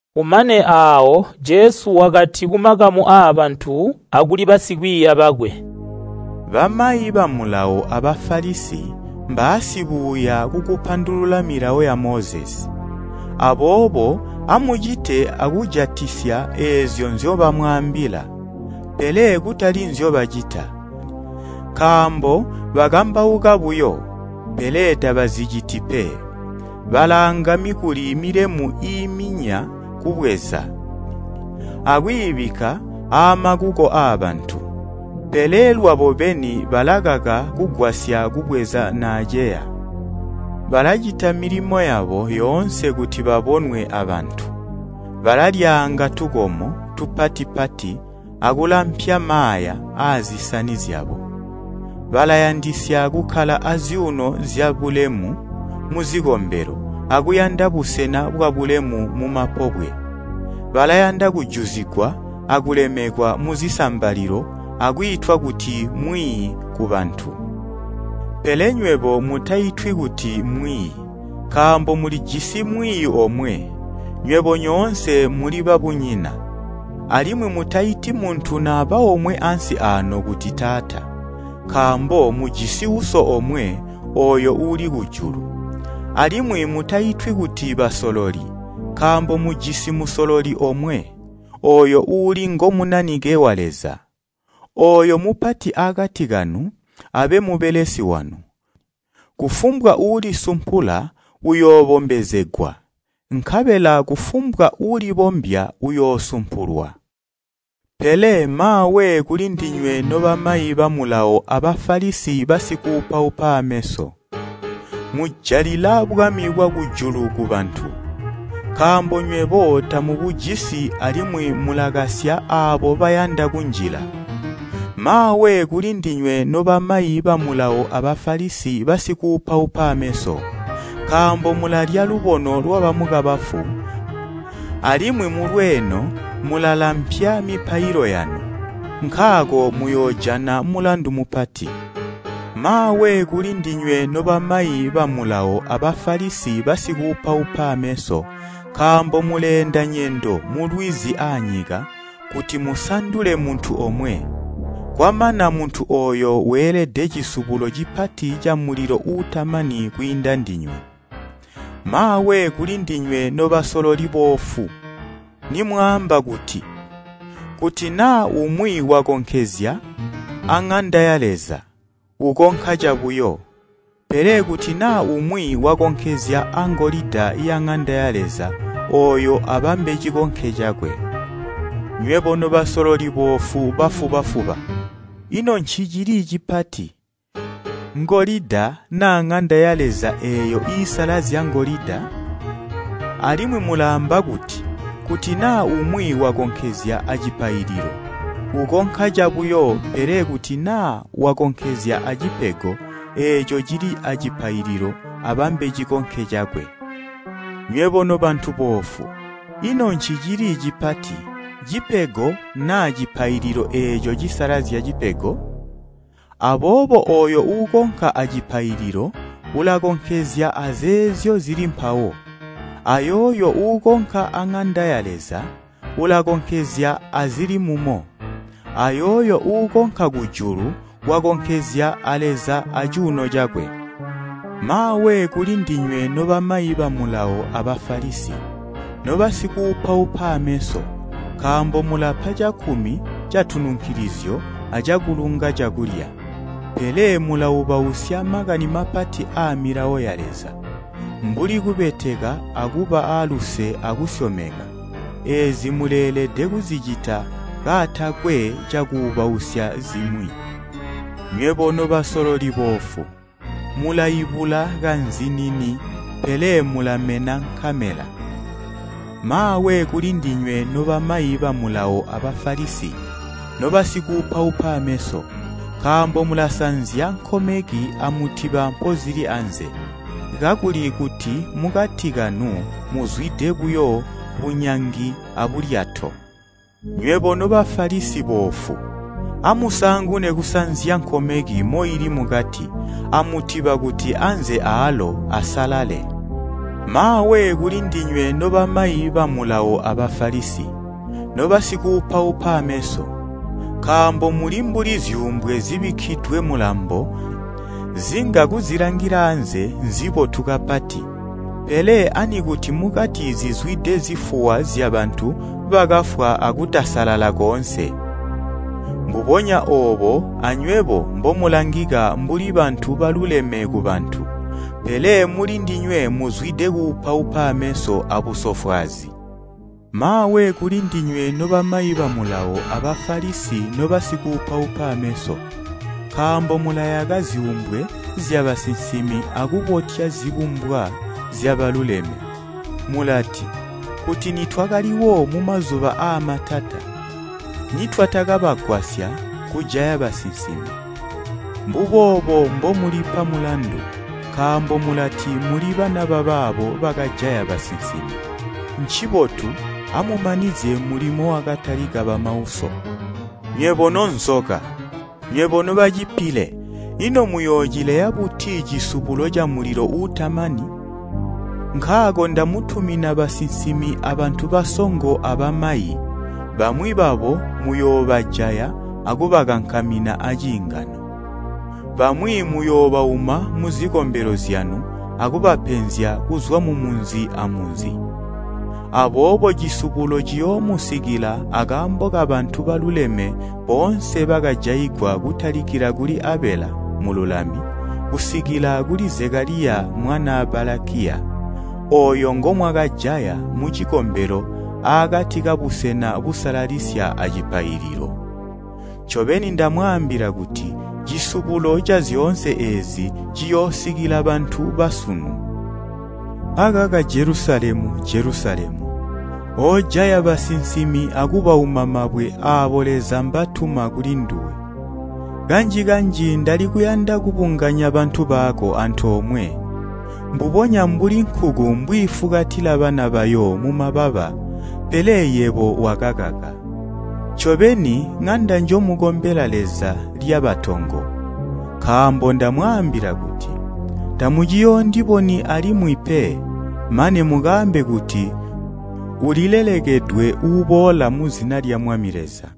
Kumane aawo Jesu wakati kumakamu aabantu akuli basikwiiya bakwe, “Bamayi ba Mulawo a Bafalisi balapandulula milawo ya Mozesi. Aboobo amucite akujatisya eezyo nzyobamwaambila. Pele kutali nzyobacita, nkaambo bakambauka buyo, pele tabaziciti pe. Balaanga mikuli milemu iiminya kubweza, akwiibikka aamakuko aabantu, pele lwabo beni balakaka kugwasya kubweza naaceya. Balacita milimo yabo yoonse kuti babonwe abantu. Balalyaanga tukomo tupati-pati akulampya maaya aazisani zyabo. Balayandisya kukkala azyuuno zyabulemu muzikombelo akuyanda busena bwabulemu mumapobwe. Balayanda kujuzigwa akulemekwa muzisambalilo akwiitwa kuti mwiiyi kubantu. Pele nywebo mutaitwi kuti mwiiyi, nkaambo mulijisi mwiiyi omwe, nywebo nyoonse muli babunyina. Alimwi mutaiti muntu naba omwe ansi aano kuti Taata, nkaambo mujisi Uso omwe, ooyo uuli kujulu. Alimwi mutaitwi kuti basololi, nkaambo mujisi musololi omwe, ooyo uuli ngo Munanike wa Leza. Ooyo mupati aakati kanu abe mubelesi wanu, kufumbwa uulisumpula uyoobombezegwa, nkabela kufumbwa uulibombya uyoosumpulwa. “Pele maawe kulindinywe nobamayi ba Mulawo a Bafalisi basikuupaupa aameso! Mujalila bwami bwakujulu kubantu. Nkaambo nywebo tamubujisi alimwi mulakasya aabo bayanda kunjila. [ Maawe kulindinywe nobamayi ba Mulawo a Bafalisi basikuupaupa aameso! Nkaambo mulalya lubono lwabamukabafu alimwi mulweeno mulalampya mipailo yanu. Nkaako muyoojana mulandu mupati.] “Maawe kulindinywe nobamayi ba Mulawo a Bafalisi basikuupaupa aameso nkaambo muleenda nyendo mulwizi aanyika kuti musandule muntu omwe, kwamana muntu ooyo weelede cisubulo cipati camulilo uutamani kwiinda ndinywe. “Maawe kulindinywe nobasololi boofu, nimwaamba kuti, ‘Kuti naa umwi wakonkezya aŋanda ya Leza, ukonka cabuyo, pele kuti naa umwi wakonkezya angolida yaŋanda ya Leza ooyo abambe cikonke cakwe.’ Nywebo nobasololi boofu bafuba-fuba! Ino ncicili cipati, ngolida naa ŋanda ya Leza eeyo iisalazya ngolida? Alimwi mulaamba kuti, ‘Kuti naa umwi wakonkezya acipaililo, ukonka cabuyo pele kuti naa wakonkezya acipego eeco cili acipaililo abambe cikonke cakwe.’ Nyweho nobantu boofu! Ino ncicili cipati, cipego naa cipaililo eeco cisalazya cipego? Aboobo ooyo uukonka acipaililo ulakonkezya azeezyo zili mpawo. Ayooyo uukonka aŋanda ya Leza ulakonkezya azili mumo. Ayooyo uukonka kujulu wakonkezya a Leza acuuno cakwe. “Maawe kulindinywe nobamayi ba Mulawo a Bafalisi, nobasikuupaupa aameso nkaambo mulapa cakkumi catununkilizyo acakulunga cakulya, pele mulaubausya makani mapati aa Milawo ya Leza, mbuli kubeteka akuba aaluse akusyomeka. Eezi muleelede kuzicita kaatakwe cakuubausya zimwi. Nywebo nobasololi boofu, mulaibula kazinini pele mulamena nkamela! “Maawe kulindinywe nobamayi ba Mulawo a Bafalisi, nobasikuupaupa aameso! Nkaambo mulasanzya nkomeki amutiba mpozili anze, kakuli kuti mukati kanu muzwide buyo bunyangi abulyato. Nywebo no Bafalisi boofu, amusaangune kusanzya nkomeki moili mukati amutiba kuti anze aalo asalale. “Maawe kulindinywe nobamayi ba Mulawo a Bafalisi, nobasikuupaupa aameso! Nkaambo muli mbuli zyuumbwe zibikkidwe mulambo zinga kuzilangila aanze nzibotu kapati, pele anikuti mukati zizwide zifuwa zyabantu bakafwa akutasalala koonse. Mbubonya oobo anywebo mbomulangika mbuli bantu baluleme kubantu, pele mulindinywe muzwide kuupaupa aameso abusofwaazi. “Maawe kulindinywe nobamayi ba Mulawo a Bafalisi nobasikuupaupa ameso! Nkaambo mulayaka zyuumbwe zyabasinsimi akubotya zibumbwa zyabaluleme mulati, ‘Kuti nitwakaliwo mumazuba aamatata nitwatakabagwasya kujaya basinsimi.’ Mbuboobo mbomulipa mulandu, nkaambo mulati muli bana babaabo bakajaya basinsimi. Ncibotu, amumanizye mulimo wakatalika bamauso. Nywebo nonzoka, nywebo nobacipile, ino muyoocileya buti cisubulo camulilo uutamani? Nkaako ndamutumina basinsimi abantu basongo abamayi, bamwi babo muyoobajaya akubakankamina aaciingano. Bamwi muyoobauma muzikombelo zyanu akubapenzya kuzwa mu munzi amunzi. Aboobo cisubulo ciyoomusikila akaambo kabantu baluleme boonse bakajaigwa kutalikila kuli Abela mululami, kusikila kuli Zekaliya mwanaa Balakiya, ooyo ngomwakajaya mucikombelo aakati kabusena busalalisya acipaililo. Ncobeni, ndamwaambila kuti, cisubulo cazyoonse eezi ciyoosikila bantu basunu. “Akaka Jelusalemu, Jelusalemu, oojaya basinsimi akubauma mabwe aabo Leza mbatuma kulinduwe! Kanji-kanji ndalikuyanda kubunganya bantu bako antoomwe, mbubonya mbuli nkuku mbwiifukatila bana bayo mumababa pele yebo wakakaka! Ncobeni ŋanda njomukombela Leza lyaba tongo. Nkaambo ndamwaambila kuti, tamuciyoondiboni alimwi pe, mane mukaambe kuti, ‘Ulilelekedwe uuboola muzina lya Mwami Leza.’”